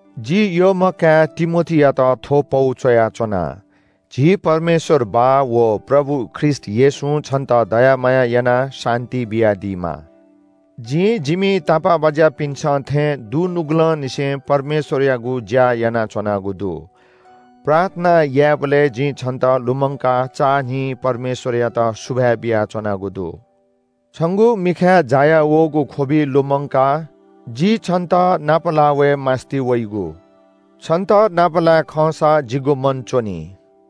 जि यःम्‍ह काय् तिमोथीयात थ्‍व पौ च्‍वयाच्‍वना। झी परमेश्‍वर बाः व प्रभु ख्रीष्‍ट येशूं छन्‍त दया माया यानाः शान्‍ति बियादीमा। जिं जिमि तापाःबाज्‍यापिन्‍सं थें दुनुगलंनिसें परमेश्‍वरयागु ज्‍या यानाच्‍वनागु दु। प्रार्थना यायेबलय् जिं छन्‍त लुमंकाः चान्‍हिं परमेश्‍वरयात सुभाय् बियाच्‍वनागु दु। छंगु मिखाय् जाया वःगु ख्‍वबि लुमंकाः जि छन्‍त नापलाः वये मास्‍ति वइगु। छन्‍त नापलाये खंसा जिगु मन च्‍वनी।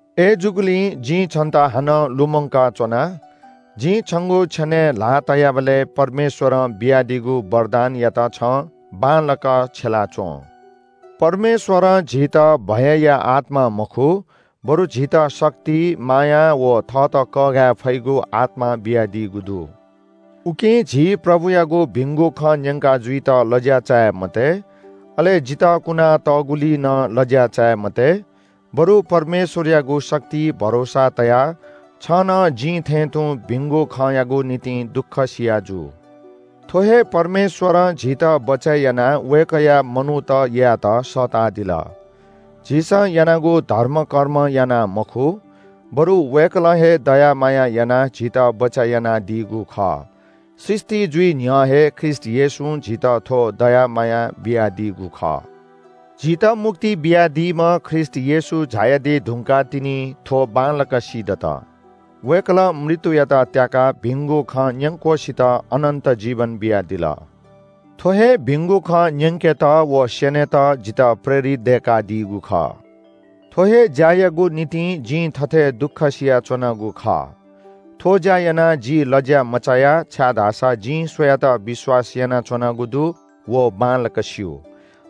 अय्‌जूगुलिं जिं छन्‍त हानं लुमंका च्‍वना – जिं छंगु छेनय् ल्‍हाः तयाबलय् परमेश्‍वरं बियादीगु वरदानयात छं बांलाक छ्यला च्‍वँ। परमेश्‍वरं झीत भयया आत्‍मा मखु, बरु झीत शक्ति, माया व थःत कःघाये फइगु आत्‍मा बियादीगु दु। उकिं झी प्रभुयागु भिंगु खँ न्‍यंका जुइत लज्‍या चाये मते, अले जितः कुनातःगुलिइ नं लज्‍या चाये मते, बरु परमेश्‍वरयागु शक्तिइ भरोसा तयाः छं नं जिं थें तुं भिंगु खँयागु निंतिं दुःखसिया जु। थ्‍व हे परमेश्‍वरं झीत बचय् यानाः वय्‌कःया मनूत यायेत सःतादिल। झीसं यानागु धर्मकर्मं यानाः मखु, बरु वय्‌कलं हे दया माया यानाः झीत बचय् यानादीगु खः। सृष्‍टि जुइ न्‍ह्यः हे ख्रीष्‍ट येशूं झीत थ्‍व दया माया बियादीगु खः। झीत मुक्ति बियादीम्‍ह ख्रीष्‍ट येशू झायादी धुंकाः तिनि थ्‍व बांलाक सीदत। वय्‌कलं मृत्‍युयात त्‍याकाः भिंगु खँ न्‍यंक्‍वसित अनन्‍त जीवन बियादिल। थ्‍व हे भिगुं खँ न्‍यंकेत व स्‍यनेत जितः प्रेरित दय्‌कादीगु खः। थ्‍व हे ज्‍यायागु निंतिं जिं थथे दुःखसिया च्‍वनागु खः। थ्‍व ज्‍या यानाः जि लज्‍यामचाया छाय्‌धाःसा जिं सुयात विश्‍वास यानाच्‍वनागु दु व बांलाक स्‍यू।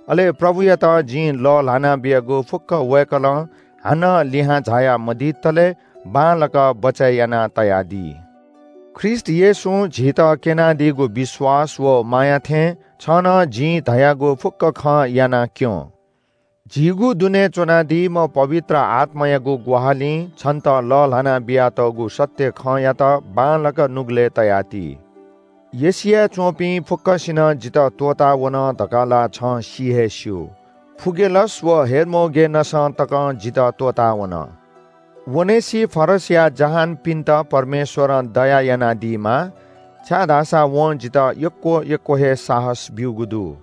अले प्रभुयात जिं लःल्‍हाना बियागु फुक्‍क वय्‌कलं हानं लिहां झाया मदितले बांलाक बचय् यानातयादी। ख्रीष्‍ट येशूं झीत क्‍यनादीगु विश्‍वास व माया थें छं नं जिं धयागु फुक्‍क खँ याना क्‍यँ। झीगु दुने च्‍वनादीम्‍ह पवित्र आत्‍मायागु ग्‍वाहालिं छन्‍त लःल्‍हाना बियातःगु सत्‍य खँयात बांलाक नुगलय् तयाति। एशियाय् च्‍वंपिं फुक्‍कसिनं जितः त्‍वःतावन धकाः ला छं सि हे स्‍यू। फुगेलस व हेर्मोगेनसं तकं जितः त्‍वःतावन। ओनेसिफरसया जहानपिन्‍त परमेश्‍वरं दया यानादीमा, छाय्‌धाःसा वं जितः यक्‍व यक्‍व हे साहस ब्‍यूगु दु।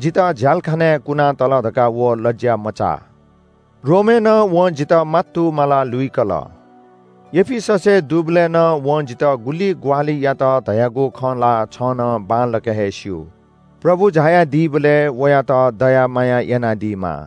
जितः झ्‍यालखानाय् कुनातल धकाः व लज्‍या मचाः। रोमय् नं वं जितः मात्तुमालाः लुइकल। एफिससय् दुबलय् नं वं जितः गुलि ग्‍वाहालि यात धयागु खँ ला छं नं बांलाक हे स्‍यू। प्रभु झायादीबलय् वयात दया माया यानादीमा।